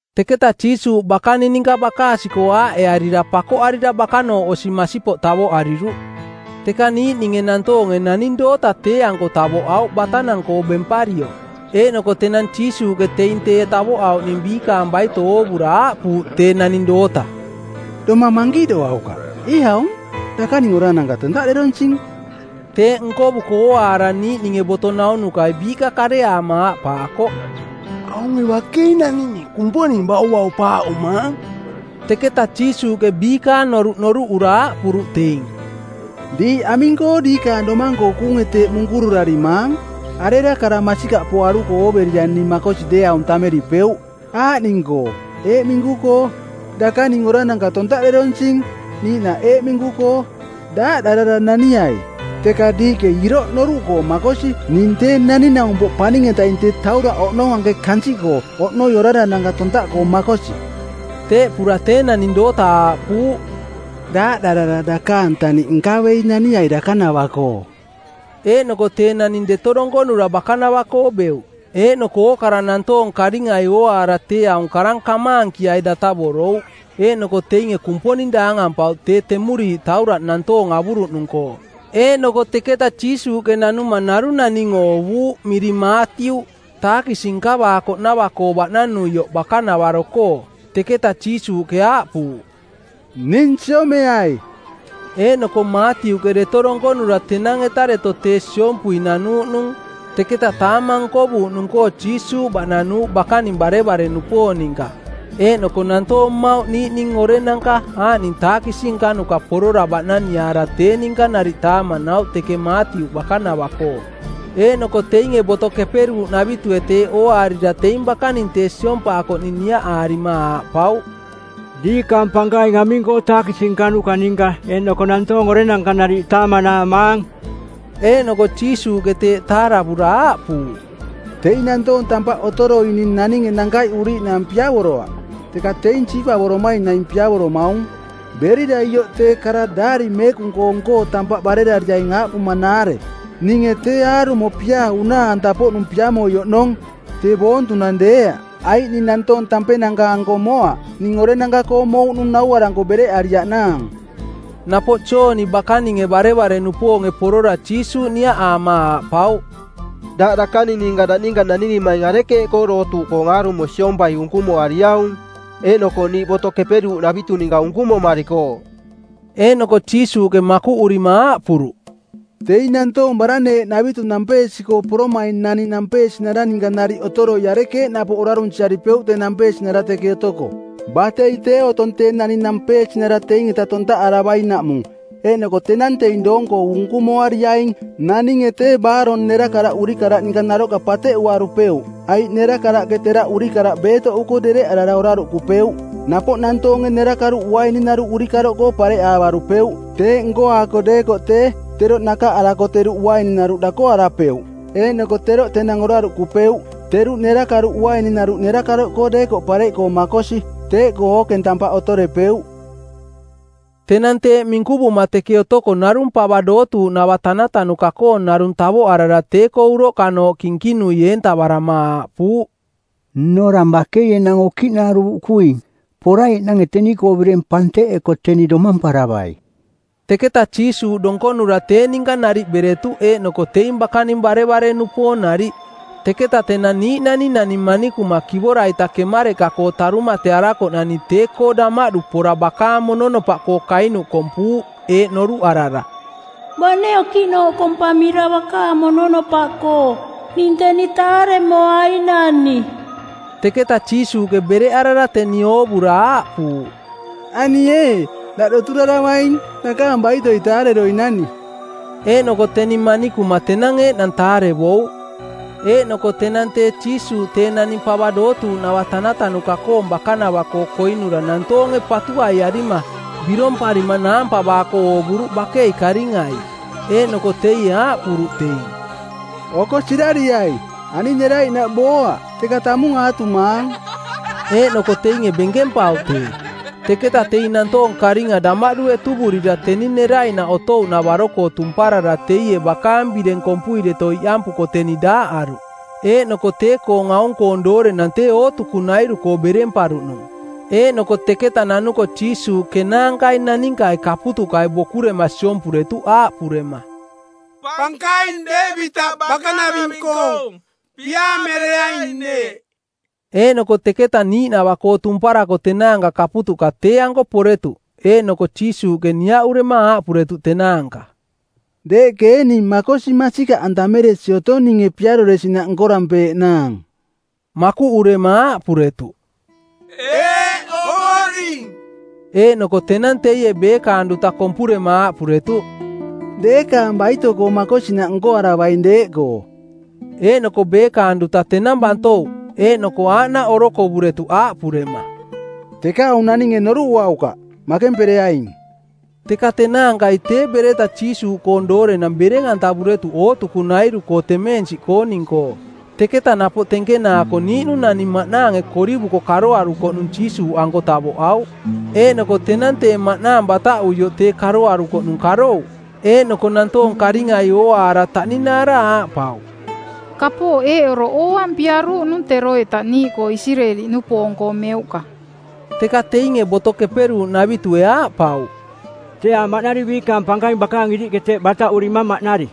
Teketa Jiisuuꞌ bakaning ninka bakaasi-koo aaꞌearira pakoꞌarira bakanooꞌ osi masipoꞌ tavoꞌariruꞌ. Teka niiꞌninge nantoonge naning doota tee-anko tavoꞌauꞌ batanang-koo bemparioꞌ. Eeꞌnoko tenang Jiisuuꞌke teing tee tavoꞌauꞌning biikaang baito oovura aaꞌpuuꞌ tee naning doota, “Domang mankiꞌdoaukaꞌ, ee aung, dakaning orarananka tontaꞌderonsing.” Teeꞌ nkovuko ooaara niiꞌninge boto naunukai biiꞌka kareaama aaꞌpaakoꞌ, “Aunge bakei naninge Kumponing bauvaupaaꞌumaang.” Teketa Jiisuuꞌke biikaang noruꞌ noruꞌura aaꞌpuruꞌ teing, “Diiꞌ aming-koo diikaang domang-koo kuunge teeꞌ munkururarimaang? Arera kara masikaꞌpoaruko ooverira ning makosi deeaung tammeripeuꞌ aaꞌning-koo eeꞌ minku-koo, ‘Dakaning orarananka tontaꞌderonsing,’ niiꞌnaꞌ eeꞌ minku-koo, ‘Daaꞌdarara naniai.’? Teka diiꞌke iroꞌ noruꞌkoo makosi ning Tee Naning-naumpoꞌ Paning-etaing tee tauraꞌ oꞌnong anke kansiꞌkoo oꞌnoi orarananka tontaꞌkoo makosi...” Teeꞌpura tee naning doota aaꞌpuuꞌ, “Daaꞌdarara dakaang taniꞌ nkavei naniai dakanava-koo.” Eeꞌnoko tee naning deto donkonura bakanava-koo beuꞌ. Eeꞌnoko ookara nantoong karingai ooaara tee aung karang kamaankiai datavorouꞌ. Eeꞌnoko teinge Kumponing daangampauꞌ tee temuriiꞌ tauraꞌ nantoong avuruꞌnung-koo. Eeꞌnoko teketa Jiisuuꞌke nanuma narung naning oovuuꞌ miring Maatiuꞌ, taakisi nkavaakoꞌnava-koo baꞌnanuioꞌ bakanavaro-koo. Teketa Jiisuuꞌke aaꞌpuuꞌ, “Ning siomeai.” Eeꞌnoko Maatiuꞌke deto donkonura tenang-eta deto tee siompui nanuuꞌnung. Teketa taamang nkovuuꞌnung-koo Jiisuuꞌ baꞌnanuuꞌ bakaning barevare-nupoong ninka eeꞌnoko nantoong mmauꞌ niiꞌning orenanka aaꞌning taakisi nkanuka porora baꞌnaniaara tee ninka nariꞌ taamanauꞌ teke Maatiuꞌ bakanava-koo. Eeꞌnoko teinge Boto Keperuuꞌnavitue teeꞌ ooaarira teing bakaning tee siompaakoꞌning niaꞌaarima aaꞌpauꞌ, “Diikaang pankaing aming-koo taakisi nkanuka ninka eeꞌnoko nantoong orenanka nariꞌ taamanaamaang?” Eeꞌnoko Jiisuuꞌke teeꞌ taaravura aaꞌpuuꞌ, “Teing nantoong tampaꞌ otoroining naninge nankaiꞌuriiꞌnaang piavoroaꞌ, teka teing siipavoromaing naing piavoromaung. Berira ioꞌ tee kara daari meekung-koong-koo tampaꞌ barerariaing aaꞌpumanaare, ‘Ninge tee aarumo piaa unaa-anta-poꞌnung piamoi oꞌnong, tee boontunang deeaꞌ.’ Aiꞌ ning nantoong tampenanka-anko moaꞌ. Ning orenanka-koo mouꞌnung nauaranko bereꞌariaꞌnaang.” Napoꞌ Jooni bakaninge barevare-nupoonge porora Jiisuuꞌ niaꞌaama aaꞌpauꞌ, “Daꞌ dakaning daꞌ ninka nanirimaing arekeeꞌkoo dootuuꞌkoong aarumo siompai unkumuariaung? Eeꞌnoko niiꞌ Boto Keperuuꞌnavitu ninka unkumumarikooꞌ.” Eeꞌnoko Jiisuuꞌke makuꞌurima aaꞌpuruꞌ, “Teing nantoong baraneeꞌnavitu nampeesi-koo poromaing naning nampeesinara ninka nariꞌ otoroi arekeeꞌ napoꞌ orarunsiaripeuꞌ tee nampeesinara teke otoko? Batei tee otong tee naning nampeesinara teing-eta tontaꞌaravainaꞌmung, eeꞌnoko tenang teing doong-koo unkumoariaing. Naninge tee baarong nerakaraꞌ urikaraꞌ ninka naroꞌka pateꞌuarupeuꞌ, aiꞌ nerakaraꞌke teraꞌ urikaraꞌ beetoꞌuko dereꞌarara oraruꞌkupeuꞌ. Napoꞌ nantoonge nerakaruꞌ uaininaruꞌ urikaroꞌkoo pareꞌaavarupeuꞌ. Teeꞌ nkoaako deekoꞌ tee, teroꞌ nakaꞌarako teruꞌ uaininaruꞌ dakoarapeuꞌ eeꞌnoko teroꞌ tenang oraruꞌkupeuꞌ. Teruꞌ nerakaruꞌ uaininaruꞌ nerakaroꞌkoo deekoꞌ pareꞌkoo makosi, teeꞌkoo ookeng tampaꞌ otorepeuꞌ.” Tenang teeꞌ minkuvuma teke otoko narung pava dootuuꞌnava tanatanuka-koong narung tavoꞌarara tee-koo uroꞌkanooꞌ kinkinui eentavarama aaꞌpuuꞌ, “Nnorang bakei enang okiꞌnaruuꞌkuing. Poraiꞌnange teni-koo bireng panteꞌeko teni domamparavai.” Teketa Jiisuuꞌ donkonura tee ninka nariꞌ beretuꞌ eeꞌnoko teing bakaning barevare-nupoong nariꞌ. Teketa tenang niiꞌnani naning manikuma kivora-ita kemareꞌka-koo tarumatearakoꞌnani tee-koo damaꞌdu pora bakaang mononopaꞌkoo kainuꞌ kompuuꞌ, eeꞌ noruꞌarara, “Bane okiꞌnooꞌ kompamira bakaang mononopaꞌkoo, ning teni taaremoainani.” Teketa Jiisuuꞌke bereꞌarara teni oovura aaꞌpuuꞌ, “Ani ee, daꞌ doturaravaing. Dakaang baitoi taareroinani.” Eeꞌnoko teni manikuma tenang eeꞌnang taarevouꞌ. Eeꞌnoko tenang tee Jiisuuꞌ tee naning pava dootuuꞌnava tanatanuka-koong bakanava-koo koinura nantoonge patuaiarima, biromparima naampavaako oovuruꞌ bakei karingai. Eeꞌnoko teie aaꞌpuruꞌ teing, “Oko sirariai, ani neraiꞌnaꞌ booaꞌ, teka tamung aatumaang.” Eeꞌnoko teinge benkempauꞌ tee. Teketa teing nantoong karinga damaꞌdu etuvurira teni neraiꞌnaꞌ otouꞌnavaro-koo tumparara teie bakaang bireng kompui deto iꞌampuko teni daaꞌaruꞌ. Eeꞌnoko tee-koong aung-koong doorenang tee ootukunairu-koo beremparuꞌnung. Eeꞌnoko teketa nanuko Jiisuuꞌ kenaankai naninkai kaputuꞌkai bokurema siompuretuꞌ aaꞌpurema, “Pankaing, Deevitaꞌ bakanaving-koong, Piaamereaing neeꞌ!” Eeꞌnoko teketa niiꞌnava-koo tumparako tenaanka kaputuꞌka tee-anko poretuꞌ, eeꞌnoko Jiisuuꞌke niaꞌurema aaꞌpuretuꞌ tenaanka, “Deeꞌke ee ning makosi masikaꞌantameresi otong ninge piaroresinaꞌ nkorampeeꞌnaang?” Makuꞌurema aaꞌpuretuꞌ, “Eeꞌ, Ovoring.” Eeꞌnoko tenang teie beekaang duta kompurema aaꞌpuretuꞌ, “Deekaang baito-koo makosinaꞌ nkoaravaing deeꞌkoo.” Eeꞌnoko beekaang duta tenang bantouꞌ. Eeꞌnoko aaꞌnaꞌ orokovuretuꞌ aaꞌpurema, “Teka aung naninge noruꞌuaukaꞌ, makempereaing.” Teka tenaankai tee bereta Jiisuuꞌkoong doorenang bereng-antavuretuꞌ ootukunairu-koo temeensiꞌkooning-koo. Teketa napoꞌ tenkenaako niiꞌnung naning maꞌnaange korivuko karoarukoꞌnung Jiisuuꞌanko tavoꞌauꞌ. Eeꞌnoko tenang tee maꞌnaang bataꞌuioꞌ tee karoarukoꞌnung karouꞌ, eeꞌnoko nantoong karingai ooaara taꞌninaara aaꞌpauꞌ, “Kapooꞌ eeꞌ oroꞌ ooampiaruuꞌnung teroita niiꞌkoo Isireeli-nupoong-koo meuꞌka.” Teka teinge boto keperuuꞌnavitue aaꞌpauꞌ, “Tee aaꞌ maꞌnari biikaang pankaing bakaang iriꞌke teeꞌ bataꞌurimang maꞌnari.”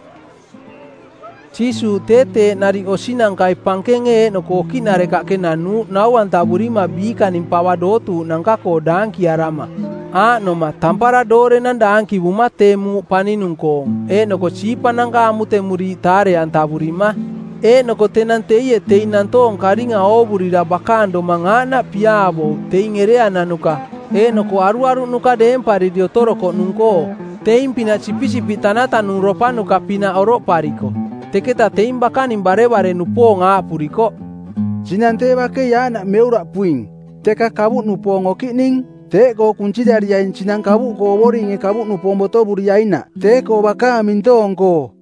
Jiisuuꞌ tee teeꞌ nariꞌ osinankai pankenge eeꞌnoko okiꞌnarekaꞌke nanuuꞌ nau-antavurima biikaning pava dootuuꞌnanka-koo daankiarama, aaꞌnoma, tampara doorenang daankivuma tee muuꞌ paninung-koong eeꞌnoko siipananka amutemuriiꞌ taare-antavurima. Eeꞌnoko tenang teie teing nantoong karinga oovurira bakaang domang aaꞌnaꞌ piaavouꞌ teing ereananuka eeꞌnoko aruaruꞌnuka deempariri otorokoꞌnung-koo, teing-pinaꞌ sipisipiꞌ tanatanungropanuka-pinaꞌ oroꞌpariko. Teketa teing bakaning barevare-nupoong aaꞌpurikoꞌ, “Sinang tee bakei aaꞌnaꞌ meuraꞌpuing, teka kavuꞌnupoong okiꞌning. Teeꞌkoo kunsirariaing sinang kavuꞌkoo Ovoringe kavuꞌnupoong botovuriainaꞌ tee-koo bakaang mintoong-koo.”